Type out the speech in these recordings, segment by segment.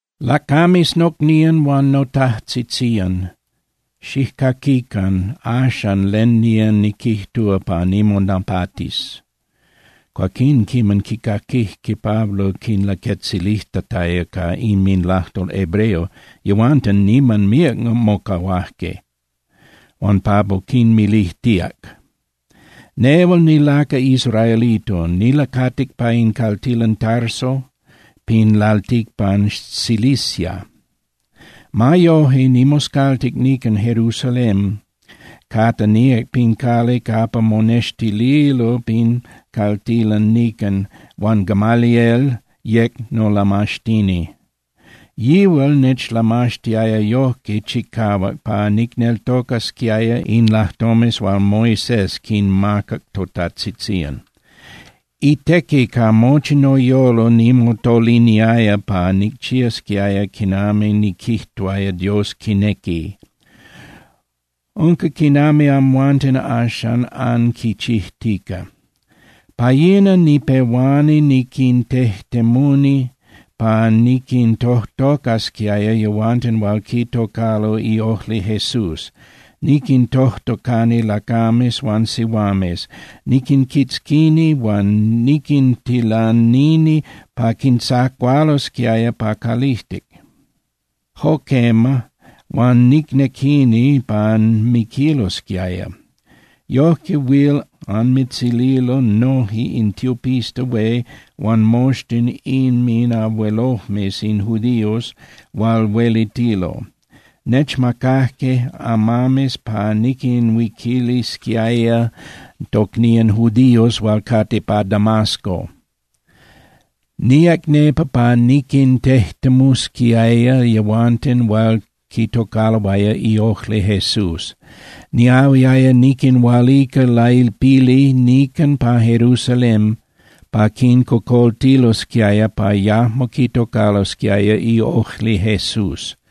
—Lacames nocnían huan notajtzitzían, xijcaquican axan len nía niquijtúa pa nimonapatis. Cuaquín quiman quicaquijque Pablo quinlaquetzilijtataya ca inminlajtol hebreo, yehuanten niman míac mocahuajque. Huan Pablo quinmilijtíac: —Nehual nilacal israelito, nilacatic pa in caltilan Tarso pin lalticpan Cilicia. Ma yoje, nimoscaltic nican Jerusalén capa níac pin cali capa monextililo pin caltilan nican, huan Gamaliel yec nolamaxtini. Yihual nechlamaxtiaya yojque chicahuac pa nicneltocasquiaya in lajtomes hual techmacajque totajtzitzían, in lajtomes hual Moisés quinmacac totajtzitzían. Itequi ca mochi noyolo nimotoliniaya pa nicchiasquiaya quinami niquijtuaya Dios quinequi. Unca quinami amhuanten axan anquichijtica. Pa yina nipehuani niquintejtemuni pa niquintojtocasquiaya yehuanten hual quitocalo iojli Jesús, niquintojtocani lacames huan sihuames, niquinquitzquini huan niquintilanini pa quintzacualosquiaya pa calijtic. Jo quema, huan nicnequini pa miquilosquiaya. Yojque huil anmitzililo noje in tiopista hué huan moxtin inminabuelojmes in judíos hual huelitilo. Nechmacajque amames pa niquinhuiquilisquiaya tocnían judíos hual cate pa Damasco. Níac nepa pa niquintejtemusquiaya yehuanten hual quitocaloaya iojli Jesús. Niahuiaya niquinhualica lailpili nican pa Jerusalén pa quincocoltilosquiaya pa yajmo quitocalosquiaya iojli Jesús.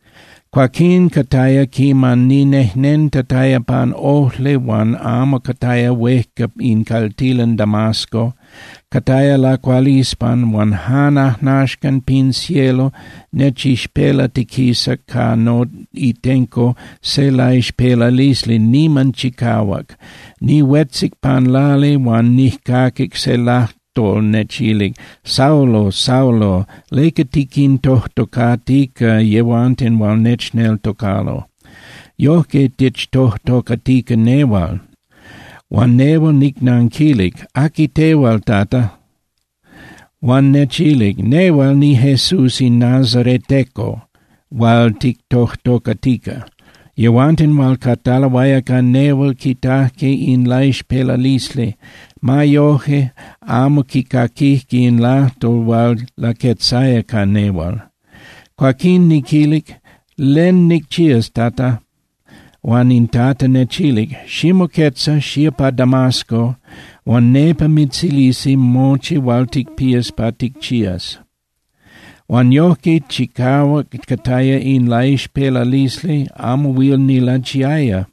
’Cuaquín cataya quiman ninejnentataya pan ojli huan amo cataya huejca in caltilan Damasco, cataya lacualispan, huan jan ajnaxcan pin cielo nechixpelatiquisac pa noitenco se laixpelalisli niman chicahuac. Nihuetzic pan lali huan nijcaquic se lajtol nechilic: “Saulo, Saulo, ¿leca tiquintojtocatica yehuanten hual nechneltocalo? Yojque tichtojtocatica nehual.” Huan nehual nicnanquilic: “¿Aqui tehual, Tata?” Huan nechilic: “Nehual niJesús in nazareteco hual tichtojtocatica.” Yehuanten hual cataloaya ca nehual quitajque in laixpelalisli. Ma yoje, amo quicaquijque in lajtol hual laquetzaya ca nehual. Cuaquín niquilic: “¿Len nicchías, Tata?” Huan in Tata nechilic: “Ximoquetza, xía pa Damasco, huan nepa mitzilisi mochi hual ticpías pa ticchías.” Huan yojque chicahuac cataya in laixpelalisli, amo huil nilachiaya.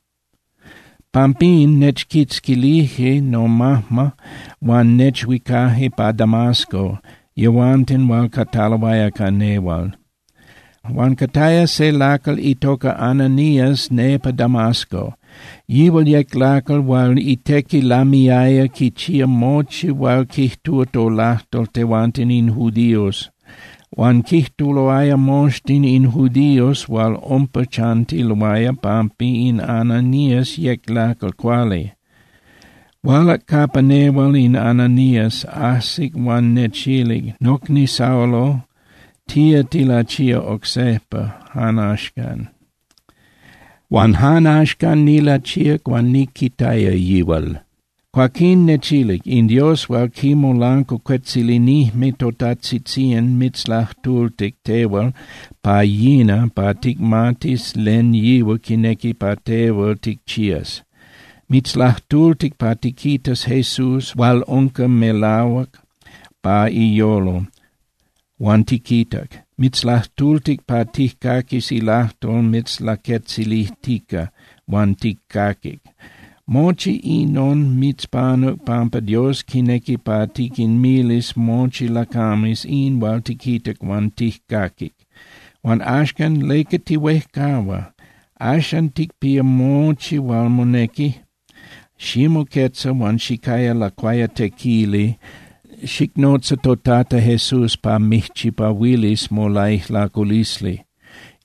Pampín nechquitzquilije nomajma huan nechhuicaje pa Damasco yehuanten hual cataloaya ca nehual. ’Huan cataya se lacal itoca Ananías nepa Damasco. Yihual yec lacal hual itequi lamiaya quichía mochi hual quijtúa tolajtol tehuanten in judíos, huan quijtuloaya moxtin in judíos hual umpa chantiloaya pampa in Ananías yec lacal cuali. Hualac capa nehual in Ananías, ajsic huan nechilic: “Nocni Saulo, tía tilachía oc sejpa jan axcan.” Huan jan axcan nilachíac huan niquitaya yihual. Cuaquín nechilic: “In Dios hual quimolancuacuetzilinijme totajtzitzían mitzlajtultic tehual pa yina pa ticmatis len yihual quinequi pa tehual ticchías. Mitzlajtultic pa tiquitas Jesús hual unca melahuac pa iyolo, huan tiquitac. Mitzlajtultic pa tijcaquis ilajtol mitzlaquetzilijtica huan tijcaquic. Mochi inon mitzpanuc pampa Dios quinequi pa tiquinmilis mochi lacames in hual tiquitac huan tijcaquic. Huan axcan, ¿leca tihuejcahua? Axan ticpía mochi hual monequi. Ximoquetza huan xicaya lacuayatequili, xicnotza toTata Jesús pa mijchipahuilis molaijlaculisli.”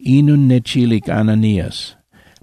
Inon nechilic Ananías.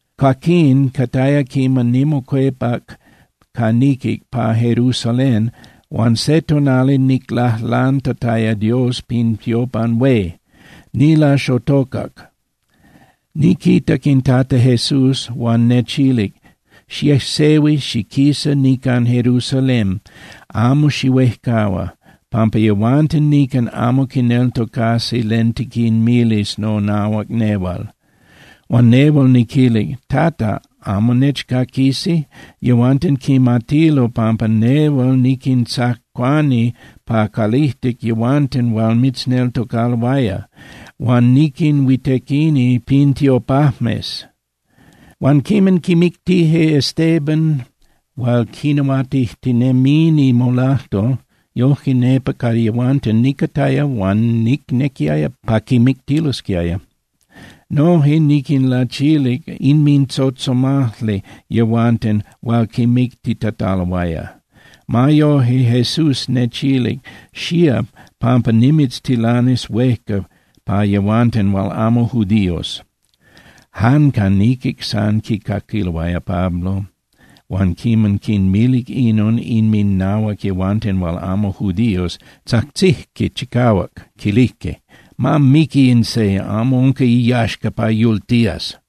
’Cuaquín cataya quiman nimocuepac ca niquic pa Jerusalén huan se tonali niclajlantataya Dios pin tiopan hué, nilaxotocac. Niquitac in Tata Jesús huan nechilic: “Xiejsehui xiquisa nican Jerusalén, amo xihuejcahua, pampa yehuanten nican amo quineltocasi len tiquinmilis nonahuac nehual.” Huan nehual niquilic: “Tata, ¿amo nechcaquisi? Yehuanten quimatilo pampa nehual niquintzacuani pa calijtic yehuanten hual mitzneltocaloaya, huan niquinhuitequini pin tiopajmes. Huan quiman quimictije Estéban hual quinahuatijtinemini molajtol, yojque nepa ca yehuanten nicataya huan nicnequiaya pa quimictilosquiaya. Noje niquinlachilic inmintzotzomajli yehuanten hual quimictitataloaya.” Ma yoje, Jesús nechilic: “Xía, pampa nimitztilanis huejca pa yehuanten hual amo judíos.” Jan ca niquic san quicaquiloaya Pablo, huan quiman quinmilic inon inminahuac yehuanten hual amo judíos, tzajtzijque chicahuac, quilijque: —¡Ma miqui in se! ¡Amo unca iyaxca pa yultías!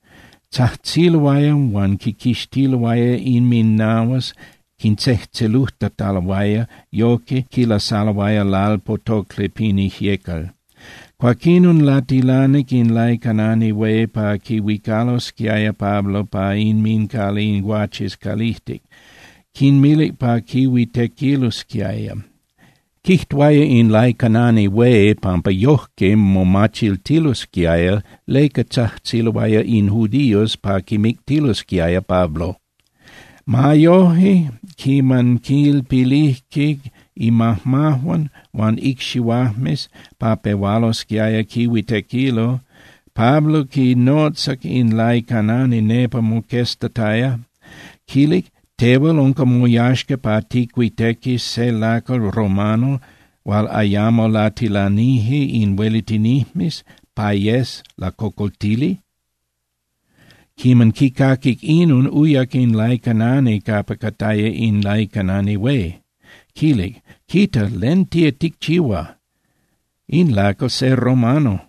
Tzajtziloaya huan quinquixtiloaya inminahuas, quintzejtzelujtataloaya, yojque quilasaloaya lalpotocli pin ijyecal. Cuaquinon latilanic in laicanani hué pa quihuicalosquiaya Pablo pa inmincali in guaches calijtic, quinmilic pa quihuitequilosquiaya. Quijtuaya in laicanani hué pampa yojque momachiltilosquiaya leca tzajtziloaya in judíos pa quimictilosquiaya Pablo. Ma yoje, quiman quilpilijque imajmajuan huan icxihuajmes pa pehualosquiaya quihuitequilo, Pablo quinotzac in laicanani nepa moqueztataya, quilic: —¿Tehual unca moyaxca pa ticuitequis se lacal romano hual ayamo latilanije in huelitinijmes pa yes lacocoltili? Quiman quicaquic inon, uyac in laicanani capa cataya in laicanani hué, quilic: —Quita. ¿Len tía ticchihua? In lacal se romano.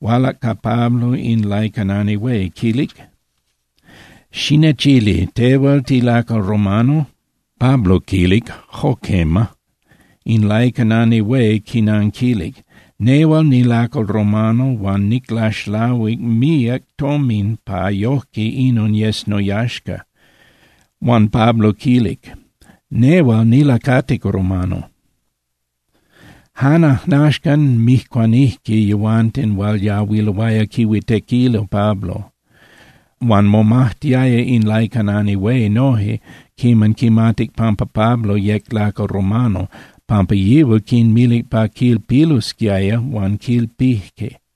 Hualac ca Pablo in laicanani hué, quilic: —Xinechili, ¿tehual tilacal romano? Pablo quilic: —Jo quema. In laicanani hué quinanquilic: —Nehual nilacal romano huan niclaxlahuic míac tomin pa yojque inon yes noyaxca. Huan Pablo quilic: —Nehual nilacatic romano. Jan ajnaxcan mijcuanijque yehuanten hual yahuiloaya quihuitequilo Pablo. Huan momajtiaya in laicanani hué noje quiman quimatic pampa Pablo yec lacal romano, pampa yihual quinmilic pa quilpilosquiaya huan quilpijque.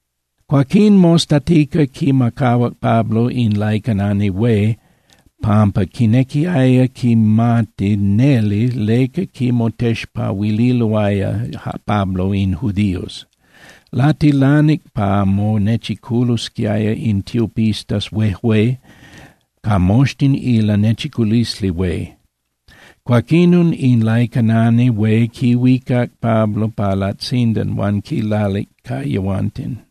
Cuaquín mostatica quimacahuac Pablo in laicanani hué pampa quinequiaya quimati neli leca quimotexpahuililoaya Pablo in judíos. Latilanic pa monechiculosquiaya in tiopistas huejué ca moxtin in Lanechiculisli Hué. Cuaquinon in laicanani hué quihuicac Pablo pa latzindan huan quilalic ca yehuanten.